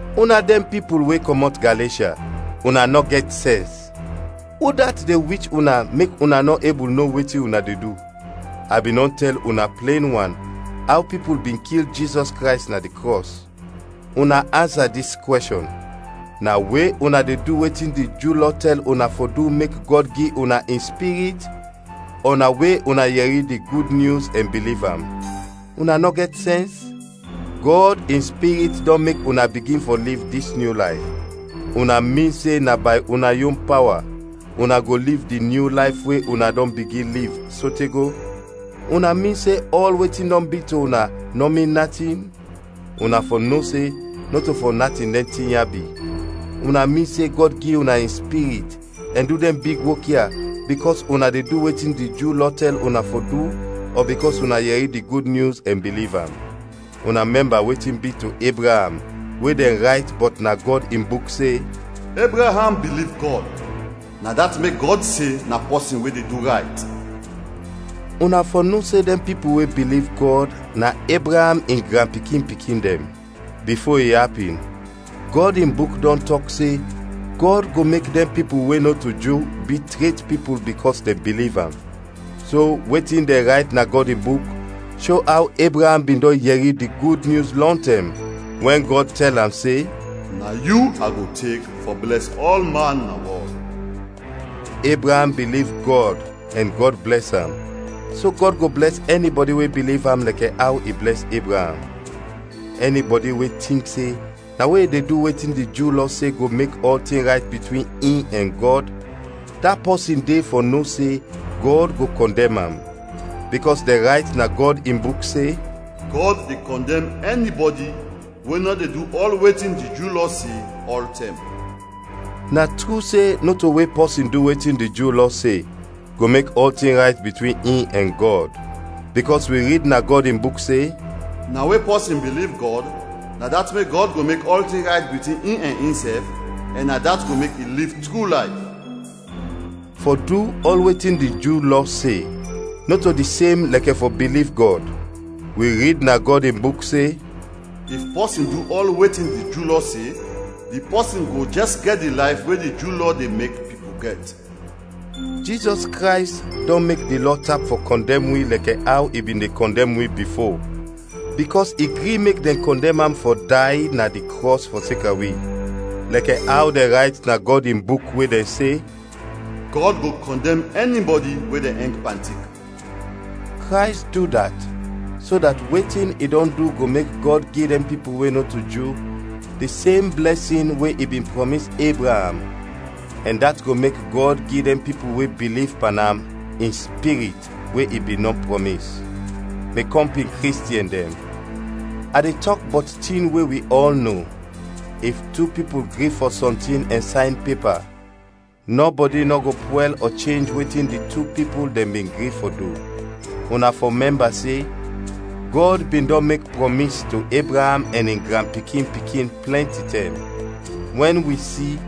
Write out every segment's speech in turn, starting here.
Una dɛn pipul we kɔmɔt Galeshya, una nɔ gɛt sɛns! Udat de wich una mek una nɔ ebul no wetin una de du? A bin dɔn tɛl una plen wan aw pipul bin kil Jizɔs Krays na di krɔs. Una ansa dis kwɛshɔn: na we una de du wetin di Ju Lɔ tɛl una fɔ du mek Gɔd gi una in Spirit, ɔ na we una yɛri di Gud Nyus ɛn biliv am? Una nɔ gɛt sɛns? Gɔd in Spirit dɔn mek una bigin fɔ liv dis nyu layf. Una min se na bay una yon pawa una go liv di nyu layf we una dɔn bigin liv, sote go? Una min se ɔl wetin dɔn bi to una nɔ min natin? Una fɔ no se nɔto fɔ natin dɛn tin ya bi. Una min se Gɔd gi una in Spirit ɛn du dɛn big wok ya, bikɔs una de du wetin di Ju Lɔ tɛl una fɔ du, ɔ bikɔs una yɛri di Gud Nyus ɛn biliv am? Una mɛmba wetin bi to Ebraam we dɛn rayt bɔt na Gɔd in Buk se, “Ebraam biliv Gɔd, na dat mek Gɔd se na pɔsin we de du rayt.” Una fɔ no se dɛn pipul we biliv Gɔd na Ebraam in granpikin-pikin dɛn. Bifo i apin, Gɔd in Buk dɔn tɔk se, Gɔd go mek dɛn pipul we nɔto Ju bi tret pipul bikɔs dɛn biliv am. So wetin dɛn rayt na Gɔd in Buk sho aw Ebraam bin dɔn yɛri di Gud Nyus lɔntɛm, wɛn Gɔd tɛl am se, “Na yu a go tek fɔ blɛs ɔlman na wɔl.” Ebraam biliv Gɔd ɛn Gɔd blɛs am, so Gɔd go blɛs ɛnibɔdi we biliv am lɛkɛ aw i blɛs Ebraam. Ɛnibɔdi we tink se na we i de du wetin di Ju Lɔ se go mek ɔltin rayt bitwin in ɛn Gɔd, da pɔsin de fɔ no se Gɔd go kɔndɛm am; bikɔs dɛn rayt na Gɔd in Buk se, “Gɔd de kɔndɛm ɛnibɔdi we nɔ de du ɔl wetin di Ju Lɔ se, ɔltɛm.” Na tru se nɔto we pɔsin du wetin di Ju Lɔ se, go mek ɔltin rayt bitwin in ɛn Gɔd, bikɔs wi rid na Gɔd in Buk se, “Na we pɔsin biliv Gɔd, na dat mek Gɔd go mek ɔltin rayt bitwin in ɛn insɛf ɛn na dat go mek i liv tru layf.” Fɔ du ɔl wetin di Ju Lɔ se, nɔto di sem lɛkɛ fɔ biliv Gɔd. Wi rid na Gɔd in Buk se, “If pɔsin du ɔl wetin di Ju Lɔ se, di pɔsin go jɛs gɛt di layf we di Ju Lɔ de mek pipul gɛt.” Jizɔs Krays dɔn mek di Lɔ tap fɔ kɔndɛm wi lɛkɛ aw i bin de kɔndɛm wi bifo, bikɔs i gri mek dɛn kɔndɛm am fɔ day na di krɔs fɔseka wi; lɛkɛ aw dɛn rayt na Gɔd in Buk we dɛn se, “Gɔd go kɔndɛm ɛnibɔdi we dɛn ɛng pan tik.” Krays du dat so dat wetin i dɔn du go mek Gɔd gi dɛn pipul we nɔto Ju di sem blɛsin we i bin prɔmis Ebraam ɛn dat go mek Gɔd gi dɛn pipul we biliv pan am, in Spirit we i bin dɔn prɔmis. Mi kɔmpin Kristiɛn dɛn, a de tɔk bɔt tin we wi ɔl no: if tu pipul gri fɔ sɔntin ɛn sayn pepa, nɔbɔdi nɔ go pwɛl ɔ chenj wetin di tu pipul dɛn bin gri fɔ du. Una fɔ mɛmba se, Gɔd bin dɔn mek prɔmis to Ebraam ɛn in granpikin-pikin plɛnti tɛm. Wɛn wi si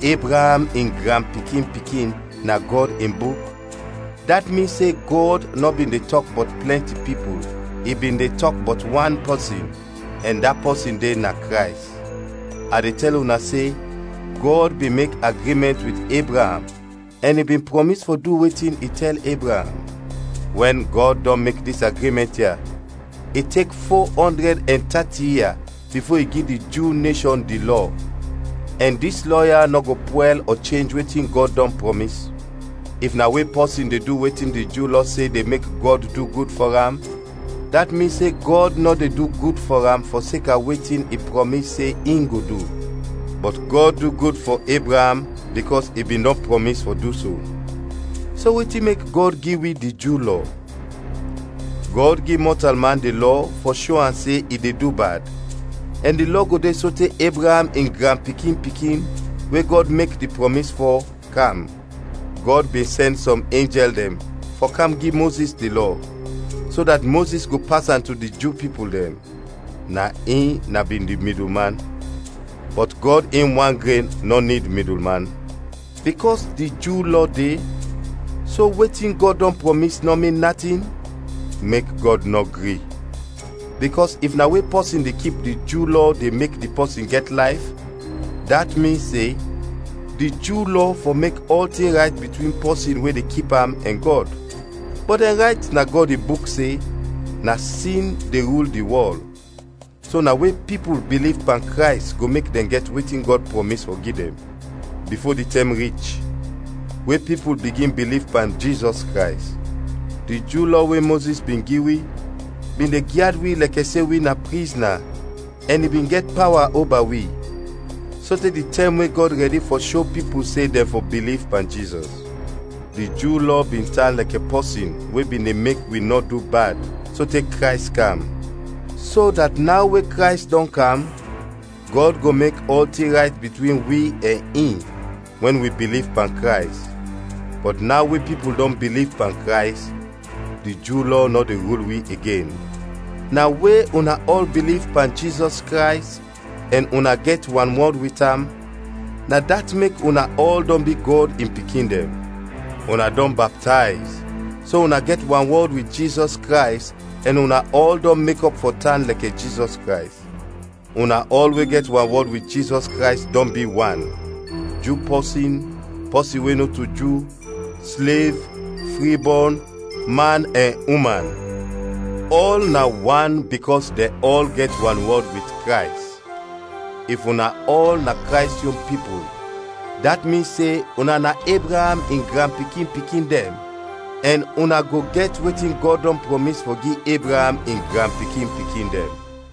“Ebraam in granpikin-pikin” na Gɔd in Buk, dat min se Gɔd nɔ bin de tɔk bɔt plɛnti pipul, i bin de tɔk bɔt wan pɔsin, ɛn da pɔsin de na Krays. A de tɛl una se Gɔd bin mek agrimɛnt wit Ebraam ɛn i bin prɔmis fɔ du wetin i tɛl Ebraam. Wɛn Gɔd dɔn mek dis agrimɛnt ya, i tek fo-ɔndrɛd ɛn tati ia bifo i gi di Ju neshɔn di Lɔ; ɛn dis Lɔ ya nɔ go pwɛl ɔ chenj wetin Gɔd dɔn prɔmis. If na we pɔsin de du wetin di Ju Lɔ se de mek Gɔd du gud fɔ am, dat min se Gɔd nɔ de du gud fɔ am fɔseka wetin i prɔmis se in go du. Bɔt Gɔd du gud fɔ Ebraam bikɔs i bin dɔn prɔmis fɔ du so. So wetin mek Gɔd gi wi di Ju Lɔ? Gɔd gi mɔtalman di Lɔ fɔ sho am se i de du bad, ɛn di Lɔ go de sote Ebraam in granpikin-pikin, we Gɔd mek di prɔmis fɔ, kam. Gɔd bin sɛn sɔm enjɛl dɛn fɔ kam gi Mozis di Lɔ, so dat Mozis go pas am to di Ju pipul dɛn; na in na bin di midulman. Bɔt Gɔd in wan gren nɔ nid midulman. Bikɔs di Ju Lɔ de, so wetin Gɔd dɔn prɔmis nɔ min natin? Mek Gɔd nɔ gri! Bikɔs if na we pɔsin de kip di Ju Lɔ de mek di pɔsin gɛt layf, dat min se, di Ju Lɔ fɔ mek ɔltin rayt bitwin pɔsin we de kip am ɛn Gɔd. Bɔt dɛn rayt na Gɔd in Buk se, na sin de rul di wɔl, so na we pipul biliv pan Krays go mek dɛn gɛt wetin Gɔd prɔmis fɔ gi dɛn. Bifo di tɛm rich we pipul bigin biliv pan Jizɔs Krays, di Ju Lɔ we Mozis bin gi wi, bin de gyad wi lɛkɛ se wi na prizna ɛn i bin gɛt pawa oba wi, sote di tɛm we Gɔd rɛdi fɔ sho pipul se dɛn fɔ biliv pan Jizɔs. Di Ju Lɔ bin tan lɛkɛ pɔsin we bin de mek wi nɔ du bad, sote Krays kam; so dat naw we Krays dɔn kam Gɔd go mek ɔltin rayt bitwin wi ɛn in, wɛn wi biliv pan Krays. Bɔt naw we pipul dɔn biliv pan Krays, di Ju Lɔ nɔ de rul wi igen. Na we una ɔl biliv pan Jizɔs Krays ɛn una gɛt wanwɔd wit am, na dat mek una ɔl dɔn bi Gɔd in pikin dɛn. Una dɔn baptayz, so una gɛt wanwɔd wit Jizɔs Krays ɛn una ɔl dɔn mekɔp fɔ tan lɛkɛ Jizɔs Krays. Una ɔl we gɛt wanwɔd wit Jizɔs Krays dɔn bi wan: Ju pɔsin, pɔsin we nɔto Ju, slev, fribɔn, man ɛn uman; ɔl na wan bikɔs dɛn ɔl gɛt wanwɔd wit Krays. If una ɔl na Krays yon pipul, dat min se una na Ebraam in granpikin-pikin dɛn, ɛn una go gɛt wetin Gɔd dɔn prɔmis fɔ gi Ebraam in granpikin-pikin dɛn.